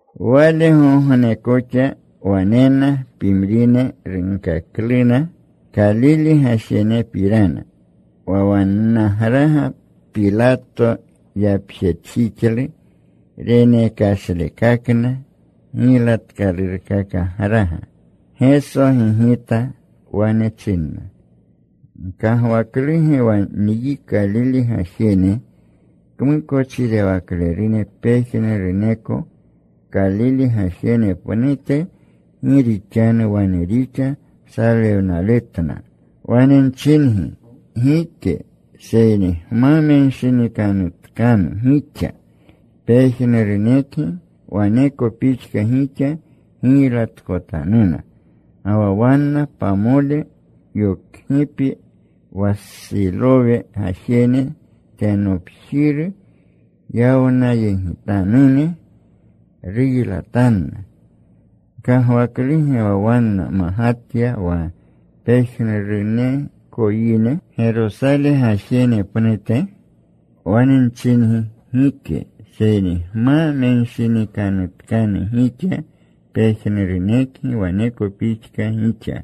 Walgogne koxa wanena pimrine. Runkakluna Kalile gajenepirana, wa wannagraga Pilato yapjetjixlu renekashlekakna giylatkalurkakagraga. Geso gigita. Wane chinna, “¿Gkagwakluge wa nyi Kalile gajene kmukochirewaklerune pejnuruneko Kalile gajene pnute gi rixanu wane rixa salewnaletna? Wane nchingi, gike. Seyni gma menshinikanutkanu gixa, pejnurunekgi waneko pixka gixa giylatkotanuna. Ga wa wanna pamole yokgipi, wa Silowe gajeru tenopjiru yawnayegitanune. Ruylatanna. ¿Gkagwakluge wa wanna magatya wa pejnuruneko yine Gerosale gajene pnute? Wane nchingi, gike. Seyni gma menshinikanutkanu gixa, pejnurunekgi waneko pixka gixa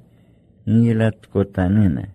giylatkotanuna.”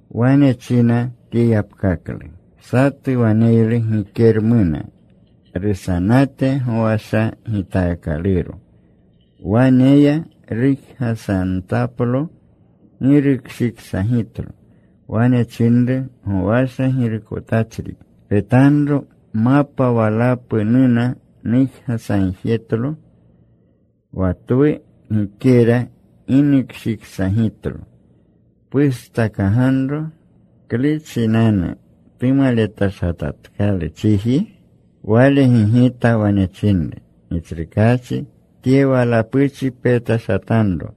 Wane china tye yapkaklu, “Satu waneylu gikeramuna rusanate gowasha gitaakaluro. Wane ya rujgasantaplo. Gi rukshiksagitlo. Wane chinru gowasha girukotachri, ‘Petanro. Mapa walapu nuna. Nujgasagjetlo wa twu gikera. Gi nukshiksagitlo. Pustakaganro. ¿Klu chinanu tumaletashatatkalu chiji?’ “Wale gigita. Wane chinru, ‘Gitsrukaachi, tye walapuchi petashatanro.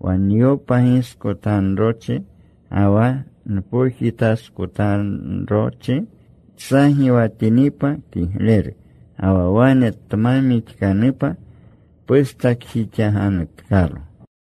Wa nyopagiskotanrochi ga wa npojitaskotanrochi. Tsagiwatinipa, kigleru. Ga wa wane tma mixkanupa, pustakjixaganutkalo.’”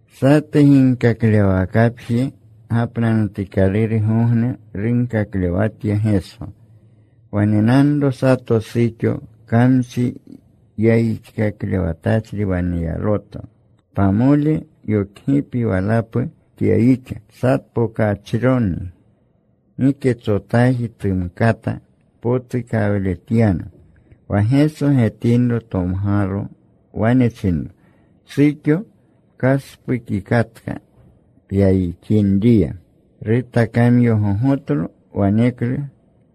Satu ginkaklewawakapji gapnanutikalurgogne runkaklewatya Geso. Wanenanro sato suxo kamchi yayixkaklewatachri waneyaluto. Pamole yokgipi walapu tyayixa. Satpokachroni. Giketsotaji tumkata potukawletyana. Wa Geso getinro, tomgalo. Wane chinro, “Suxo, pkaspukikatka pyayixinriya.” Rutakamyogogotlo. Waneklu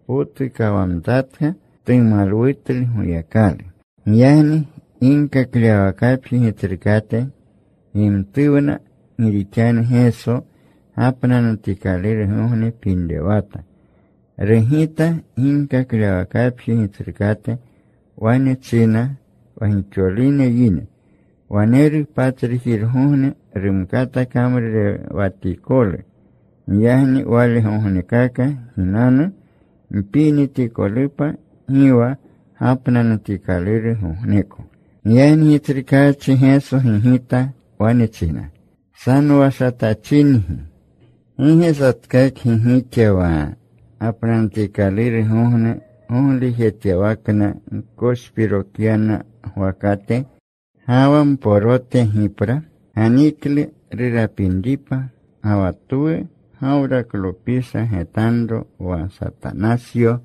tpotukawamtatka. Tumalwutlu Goyakalu. Giyagni ginkaklewwakapji gitsrukate gimtuwna gi rixanu Geso gapnanutikalurgogne pinrewata. Rugita ginkaklewwakapji gitsrukate. Wane chinna wa gixolune yine, “Waneru patsrujirgogne rumkata kamrurewatikolu. Giyagni walegognekaka ginanu mpinitikolupa. Gi wa gapnanutikalurgogneko.” Giyagni Gitsrukaachi Geso gigita. Wane china, “¡Sanowashatachingi! ¿Gi ge satkakgi gixa wa gapnanutikalurgogne goglujetyawakna gkoshpirokyana gwakate ga wa mporote gipra? Ganiklu rurapinripa. Ga wa twu Gawraklopisha, getanro, wa Satanasyo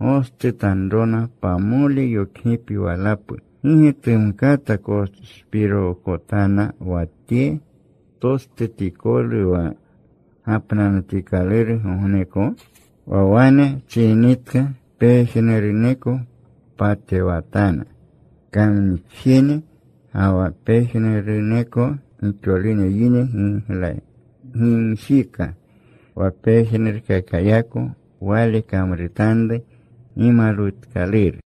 gostutanrona pamole yokgipi walapu, ¿gi ge tumkata koshpirookotana wa tye tostutikolu wa gapnanutikalurgogneko?” Wa wane chininitka, pejnuruneko patewatana kamnixjene. Ga wa pejnuruneko gixolune yine gimjika wa pejnurkakayako Wale kamrutanru gimalwutkaluru.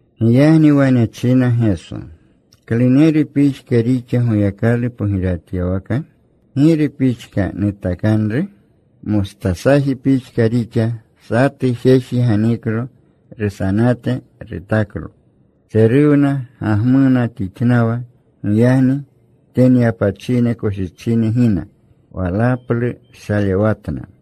Giyagni wane china Geso, “¿Kluneru pixka rixa Goyakalu pogirewatyawaka? ¿Giru pixka nutakanru? Mostasaji pixka rixa. Satu jeji ganiklo. Rusanate rutaklo. Tseruwna. Gagmuna tixnawa. Giyagni tenyapachine koshichine gina. Walaplu shalewatna.”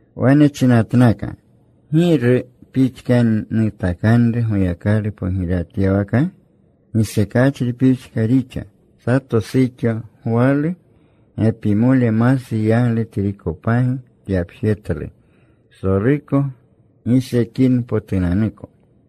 Wane chinatnaka, “¿Giru pixka nutakanru Goyakalu pogirewatyawaka? Gisekachri pixka rixa. Sato suxo gwalu. Gepimole masu yaglu trikopagi tyapjetlu, psoluko gisekinpotunanuko.”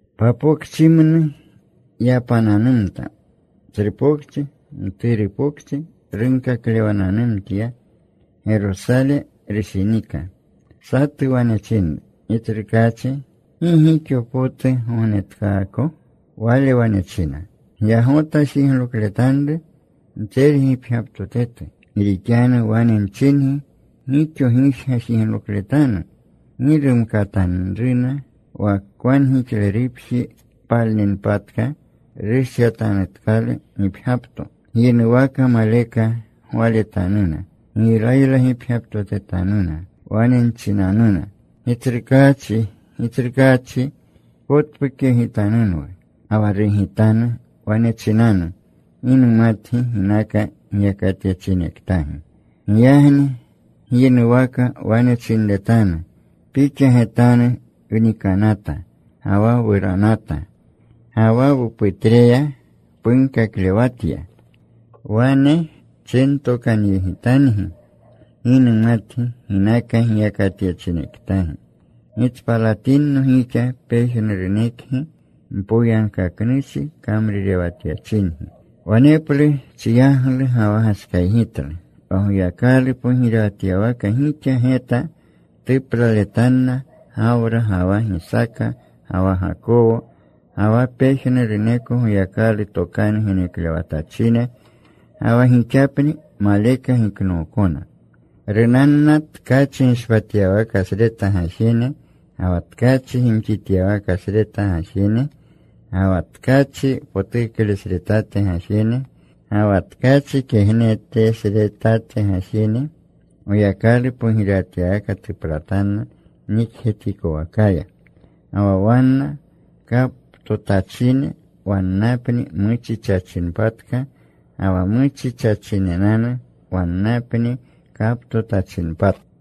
Papokchimnu yapananumta. Tsru pokchi, mturu pokchi runkaklewananumtya. Gerosale rushinika. Satu wane chinru, “Gitsrukaachi, ¿gi gixo potu gognetkaako?” Wale wane chinna, “Gyagota jiglokletanru mtsergipgyaptotetu, gi rixanu wane nchingi, gixo gijga jiglokletanu. Gi rumkatanruna. Wa kwangixlerupji palninpatka, rushyatanutkalu gipgyapto, gyinuwaka maleka gwaletanuna. Giylaylagipgyaptotetanuna. “Wane nchinanuna, ‘Gitsrukaachi, Gitsrukaachi, pkotpukyegitanunwu.’ “Ga wa rugitanu. Wane chinanu, ‘Gi numatgi, ginaka giyakatyachinektagi.’ “Giyagni gyinuwaka wane chinretanu, ‘Pixa getanu wnikanata ga wa wuranata. Ga wa wuputreya punkaklewatya.’ “Wane chintokanyegitangi, ‘Gi numatgi ginaka giyakatyachinektagi. Gitspalatinno gixa pejnurunekgi mpoyagkaknuchi kamrurewatyachingi.’ “Waneplu chiyaglu ga wa gashkaygitlu, wa Goyakalu pogirewatyawaka gixa geta tuplaletanna Gawra, ga wa Gisaaka, ga wa Gakowo, ga wa pejnuruneko Goyakalu tokanu geneklewatachine, ga wa gixapni maleka giknookona. Runanna tkachi gishpatyawakasreta gajene, ga wa tkachi gimxityawakasreta gajene, ga wa tkachi potuklesretate gajene, ga wa tkachi kegnetesretate gajene. Goyakalu pogirewatyawaka tuplatanna nikjetikowakaya. Ga wa wanena kaptotachine. Wannapni muchichachinpatka. Ga wa muchichachinenanu wannapni kaptotachinpatka.”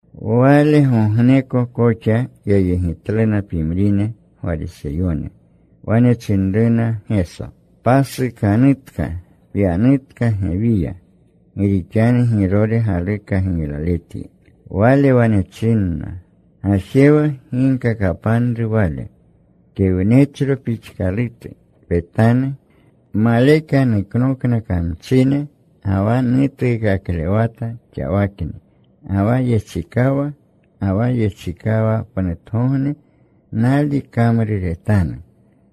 Walgogne koxa yayegitluna pimrine Gwariseyone. Wane chinruna Geso, “Pasukanutka. Pyanutka gewiya. Gi rixanu Girore galuka giylaletyi.” Wale wane chinna, “Gajewa. Ginkakapanru wale kewnechro pixkalutu, ‘Petanu. Maleka nuknokna kamchine ga wa nutuukaklewata xawakni ga wa yechikawa. Ga wa yechikawapnutgogne, nali kamruretanu.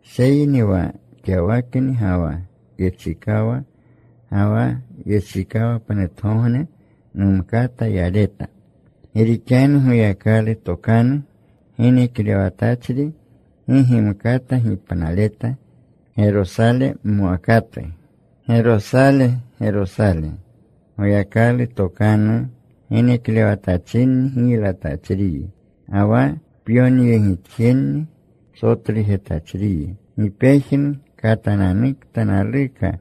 Seyni wa xawakni ga wa yechikawa ga wa yechikawpnutgogne numkata yaleta, gi rixanu Goyakalu tokanu geneklewatachri gi gimkata gipnaleta Gerosale mwakatu.’ “¡Gerosale, Gerosale! Goyakalu tokanu geneklewatachinni giylatachriyi. Ga wa pyokanyegitjenni sotlujetachriyi. ¡Gi pejnu katananukta naluka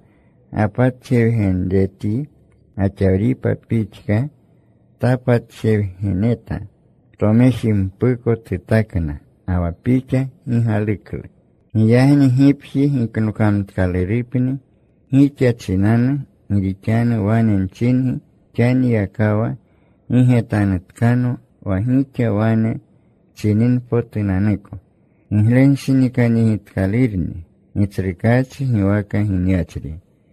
gapatjewgenretyi gaxawripa pixka tapatjewgeneta! Tomejimpuko tutakna. Ga wa pixa gi galuklu. Giyagni gipji giknokamtkalurupni gixa chinanu. Gi rixanu wane nchingi, xaniyakawa gi getanutkano wa gixa wane chininpotunanuko: Giglenshinikanyegitkalurni Gitsrukaachi giwaka ginyachri.”